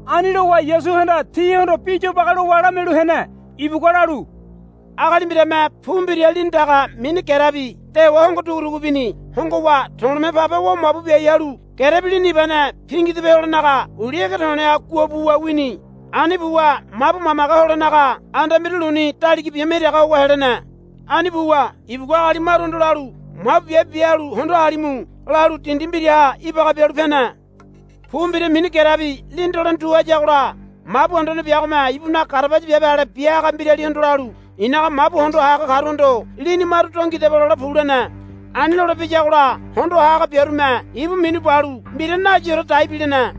Ani lowa Yasuhanda tihondo bi yobage lowa lamialu hene. Ibugua lalu, Agali mbirame pu mbira lini daga mini gerebi dewa hongo dugu dugu bini. Hongowa to̱le̱me pabe wa mabu biai halu gerebi lini ibane pingidope holenaga uli ege to̱le̱ha guabuwa wini. Ani buwa mabu mamage holenaga anda mbira luni daliga bima iraga howa helene. Ani buwa ibugua agali maruhondo lalu, Mabu biabe bia halu hondo ha halimu, lalu dindi mbiraha ibaga bialu pene. Pu mbira mini gerebi lini dolene tu hayagola mabu anduane biagome ibunaga garabaya biabe ale bia haga mbiralihondo lalu, I̱naga mabu hondo ha haga karuhondo lini maru do ngidaba lole pu, lene. Ani lole piyagola hondo ha haga biarume ibu minu balu mbira nayiore dai bilene.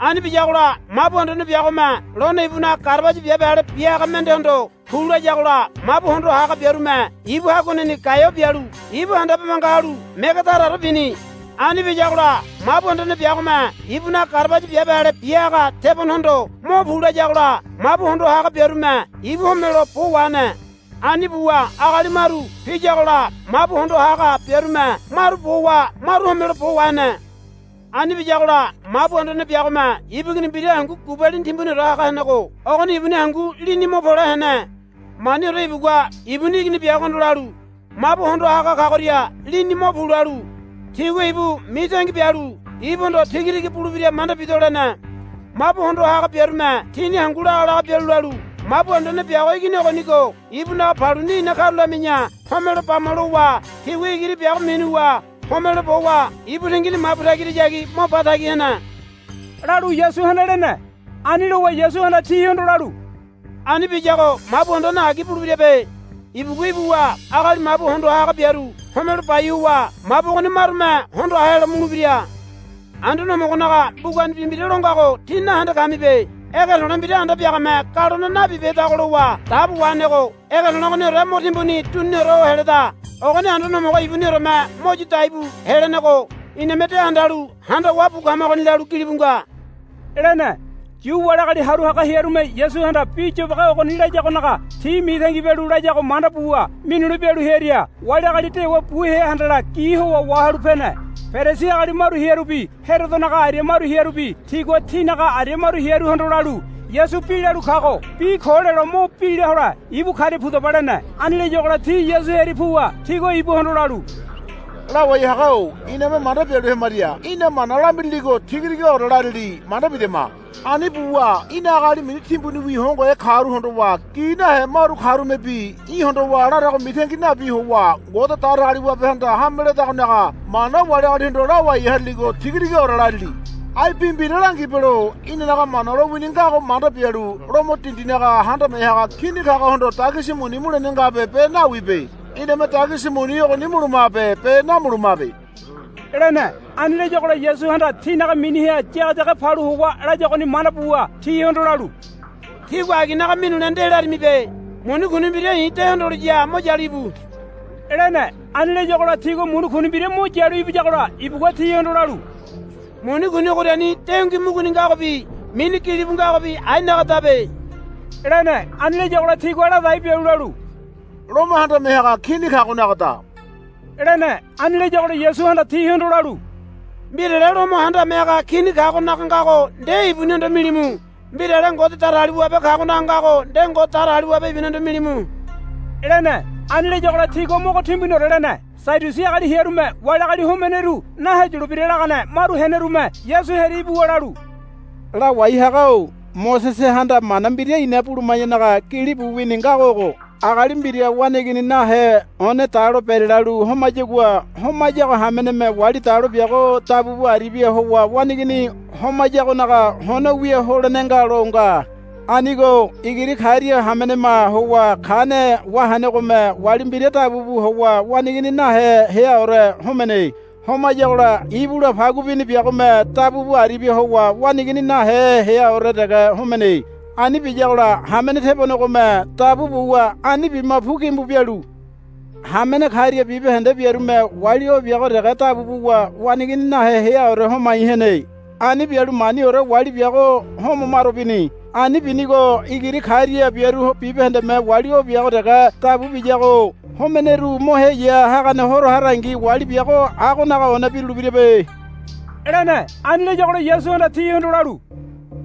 Ani biyagola mabu anduane biagome lone ibunaga garabaya biabe ale bia haga mendehondo, Pu, layagola mabu hondo ha haga biarume ibu haguaneni gaeo bialu ibu handabe manga halu mege taraore bini. Ani biyagola mabu anduane biagome ibunaga garabaya biabe ale bia haga tebonehondo, Mo pu, layagola mabu hondo ha haga biarume ibu homelo bo wahene. Ani buwa agali maru piyagola mabu hondo ha haga biarume maru bowa maru homelo bo wahene. Ani biyagola mabu anduane biagome ibu igini mbira hangu gubalini timbuniore haga henego ogoni ibuni hangu lini mo pole hene. Maniore ibugua ibuni igini biagohondo lalu, Mabu hondo ha haga kagoria lini mo pu, lalu, Tigua ibu mitangi bialu ibuhondo tiga tiga bulebira manda bido, lene. Mabu hondo ha haga biarume tini hangu laga laga bialu lalu, Mabu anduane biago igini ogonigo ibunaga paluni ina karulami̱ya homelo bama, lowa tigua igiri biago minuwa homelo bowa ibu tingini mabu tagirahayagi mo ba tagi hene, lalu Yasuhanda lene. Ani lowa Yasuhanda tihondo lalu, Ani biyago mabu anduane agi bulebirabe. Ibugua ibuwa agali mabu hondo ha haga biaru homelo bai howa mabu ogoni marume hondo ha helo mulebira. Anduane Homogonaga mbugani bi mbira lo ngago tí nahende kamibe. Ege to̱le̱ mbira anda biagame galone nabibehedago lowa dabo wahenego ege to̱le̱ ogoniore mo timbuni duniniore ho heleda. Ogoni Anduane Homogo ibunioreme mo yu daibu helenego iname de handalu handawa bu kamagoni, lalu gilibu nga, lene. Yu wali agali haru haga hearume Yasuhanda bi yobage ogoni layagonaga ti mitangi bialu layago manda buwa minule bialu hearia wali agali dewa bu hea handala gi howa wahalu pene. Perisi agali maru hearubi Herodonaga aria maru hearubi tigua tinaga aria maru hearuhondo lalu, Yasu bi lalu kago bi ko lelo mo bila hole ibu karia pudaba, lene. Ani layagola ti Yasu hearia puwa tigua ibuhondo lalu, Lawai haga-o iname manda bialu hemaria í̠na mana lamiriligo tiga tigaore larili manda bidama. Ani buwa í̠na agali mini timbuniwi hongohe karu hondowa gi nahe maru karumebi í̠ hondowa larago mitangi nabi howa Ngode Datagaliwabehanda hame ledagonaga mana wali agalihondo lawai hariligo tiga tigaore larili. Ai bi mbira langibelo inanaga Mana lowini ngago manda bialu Lomo dindinaga handame haga Kini kagohondo dagisi muni mulene ngabe be nawibe. Iname dagisi muni ogoni mulumabe be namulumabe, lene. Ani layagola Yasuhanda tinaga miniha yageyage palu howa layagoni manda buwa tihondo lalu, Tígua aginaga minule nde larimibe. Muni kuni mbira i̱ de hondoliya mo yalu íbu, lene. Ani layagola tigua muni kuni mbira mo yalu ibiyagola ibugua tihondo lalu, Muni kuni ogoriani dengui muguni ngagobi mini gilibu ngagobi ainagadabe, lene. Ani layagola tigua ladai bialu lalu, Lomo handame haga Kini kagonagada, lene. Ani layagola Yasuhanda tihondo lalu, Mbirale Lomo handame haga Kini kagonaga ngago nde ibunihondo milimu. Mbirale Ngode Datagaliwabe kagonaga ngago nde Ngode Datagaliwabe ibunihondo milimu, lene. Ani layagola tigua mogo timuniore lene. Sadiusi agali hearume wali agali homeneru naheyulebira lagane maru henerume Yasu hearia ibuwa lalu, Lawai haga-o Mosesehanda mana mbira ina buluma̱yanaga gilibu wini ngago ogo, Agali mbira waneigini nahe one dalo berelalu homayagua homayago hameneme wali dalo biago dabu bu aribia howa waneigini homayagonaga hono wia holene nga, lo nga. Anigo igiri karia hamenema howa kane wahenegome wali mbira dabu bu howa waneigini nahe heaore homene. Homayagola ibula pagu bini biagome dabu bu aribia howa waneigini nahe heaore dege homene. Ani biyagola hamene tebonegome dabu buwa ani bima pu gimbu bialu hamene karia bibahende biarume wali o biago dege dabu buwa waneigini nahe heaore homai hene. Ani bialu maniore wali biago home maro bini. Ani binigo igiri karia biaru bibahendeme wali o biago dege dabu biyago homeneru mo heya hagane horo harangi wali biago agonaga one birulebirabe, lene. Ani layagola Yasuhanda tihondo lalu,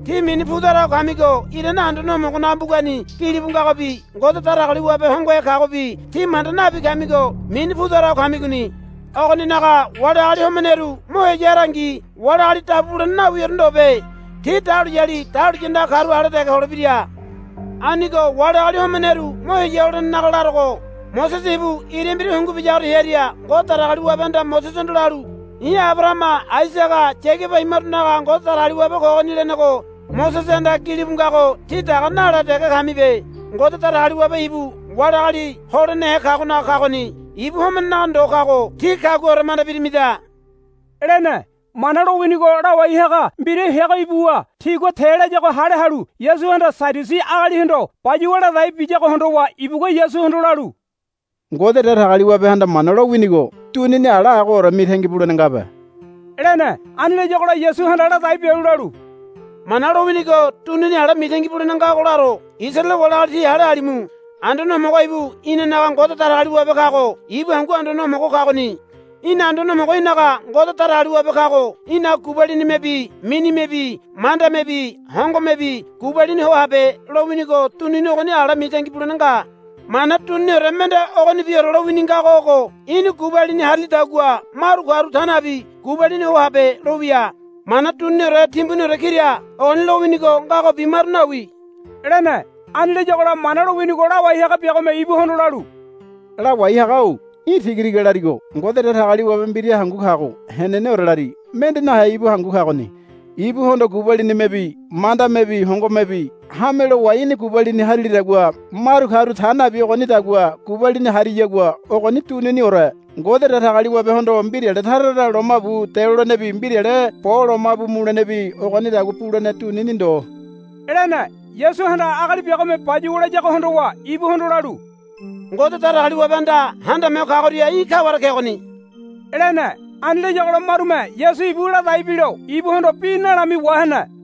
Tí mini pu tara ho kamigo irane Anduane Homogonaga mbugani gilibu ngagobi Ngode Datagaliwabe hongohe kagobi tí manda nabi kamigo mini pu tara ho kamigoni. Ogoninaga wali agali homeneru mo heya harangi wali agali dabu bulene nawiore ndobe. Ti dahuliyali dahuliya andaga karu ale dege holebira. Anigo wali agali homeneru mo heya holenenaga larogo Mosese ibu ira mbira hungu biyagoria hearia Ngode Datagaliwabehanda Mosesehondo lalu, I̱ Abarahama Aisaga Yagaba imarunaga Ngode Datagaliwabe kogoni, lenego Mosesehanda gilibu ngago tí daga nale dege kamibe. Ngode Datagaliwabe ibu wali agali holenehe kagonaga kagoni. Ibu homenenaga ndo kago tí kaguaore manda birimida, lene. Mana lowinigo lawai haga mbira heago ibuwa tigua te layago hale halu Yasuhanda Sadiusi agalihondo bayuwa ladai biyago hondowa ibugua Yasuhondo lalu, Ngode Datagaliwabehanda Mana lowinigo dunini ala agoore mitangi bulene ngabe, lene. Ani layagola Yasuhanda ladai bialu lalu, Mana lowinigo dunini ala mitangi bulene ngago laro. Isaraele wali agali tí hale halimu. Anduane Homogo ibu inanaga Ngode Datagaliwabe kago ibu hangu Anduane Homogo kagoni. Í̠na Anduane Homogo í̠naga Ngode Datagaliwabe kago í̠naga gubalinimebi minimebi mandamebi hongomebi gubalini ho habe, lowinigo dunini ogoni ala mitangi bulene nga. Mana duniniore mende ogonibiore lowini ngago ogo, Í̠ni gubalini harilidagua maru karu ta nabi gubalini ho habe, lowia. Mana duniniore timbuniore kira ogoni lowinigo ngagobi maru nawi, lene. Ani layagola Mana lowinigo lawai haga biagome ibuhondo lalu, Lawai haga-o í̠ tiga tiga larigo. Ngode Datagaliwabe mbira hangu kago heneneore lari. Mende nahe ibu hangu kagoni. Ibuhondo gubalinimebi mandamebi hongomebi hame lowa í̠ni gubalini harilidagua maru karu ta nabi ogonidagua gubalini hariyagua ogoni duniniore. Ngode Datagaliwabehondo mbirale tara tara lomabu delolenebi mbirale bo lomabu mulenebi ogonidagua bulene dunini ndo, lene. Yasuhanda agali biagome bayuwa layago hondowa ibuhondo lalu, Ngode Datagaliwabehanda Handame Ho Kagoria í̠ kaware kegoni, lene. Ani layagola marume Yasu ibu ladai bilo ibuhondo bi nalami wahene.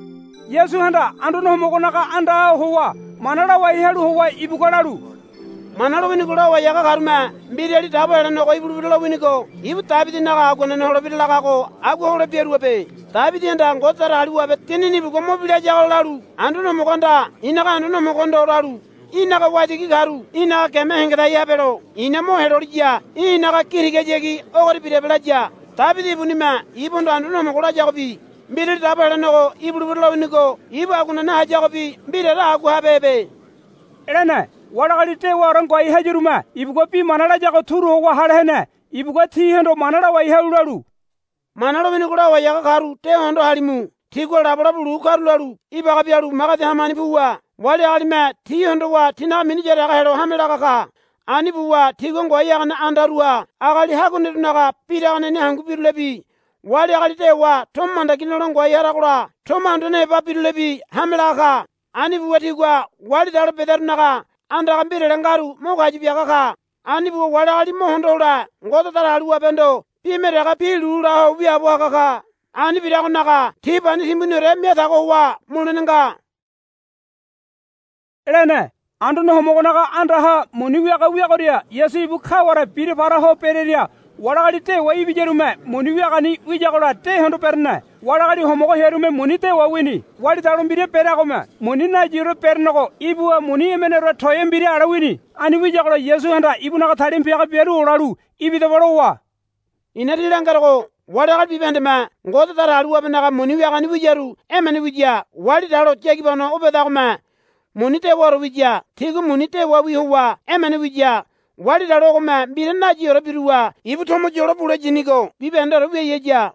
Yasuhanda Anduane Homogonaga andaha howa mana lawai halu howa ibugua lalu, Mana lowinigo lawai haga karume, Mbirali Dabo Helenego ibulebira lowinigo ibu Debidinaga aguanene holebira, lagago agua hole biaruabe. Debidihanda Ngode Datagaliwabe Dinini ibugua mo bila hayagola lalu, Anduane Homogohanda i̱naga Anduane Homogohondo lalu, Í̠naga waitigi karu í̠naga geme hengedai habelo i̱na mo heloliya í̠ i̱naga gi tigahayagi ogoria birabe, laya. Debidi ibunime ibuhondo Anduane Homogo layagobi Mbirali Dabo Helenego ibulebira lowinigo ibu aguanene hayagobi mbiraore agua habehebe, lene. Wali agali dewaore ngoai hayarume ibugua bi mana layago turu howa hale hene. Ibugua tihondo mana lawai halu lalu, Mana lowinigo lawai haga karu de hondo halimu. Tigua labolabo lu karulalu ibaga bialu magedi hamani puwa wali agalime ti hondowa tinaga mini yaraga helo hame laga ka. Ani buwa tigua ngoai hagane andaruha agali haguanerunaga biraganeni hangu birulebi wali agali dewa tomo mandagi nole ngoai haragola tomo anduane heba birulebi hame laga ka. Ani buwa tigua wali dalo bedarunaga andaga mbirale ngaru mo kayu biaga ka. Ani buwa wali agali mo hondo hole Ngode Datagaliwabehondo bime dege bi lu la ho wiaabo haga ka. Ani biragonaga ti pani timbuniore mia tago howa mulene nga, lene. Anduane Homogonaga andaha muni wiaga wiagoria Yasu ibu kaware bira para ho bereria wali agali dewa ibiyarume muni wiagani wiyagola de hondo berene. Wali agali homogo hearume muni dewa wini. Wali dalo mbira bereagome muni nayiore berenego ibuwa muni emeneore toea mbira ale wini. Ani wiyagola Yasuhanda ibunaga talima piaga biaru olalu, Ibidaba, lowa, I̱na tí langerogo wali agali bibahendeme Ngode Datagaliwabenaga muni wiagani wiyaru emene wiya. Wali dalo yagibano o bedagome muni dewaore wiya. Tigua muni dewawi howa emene wiya. Wali dalo ogome mbira nayiore biruwa ibu tomo yolo bule yinigo bibahendeore wiai haya,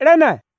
lene.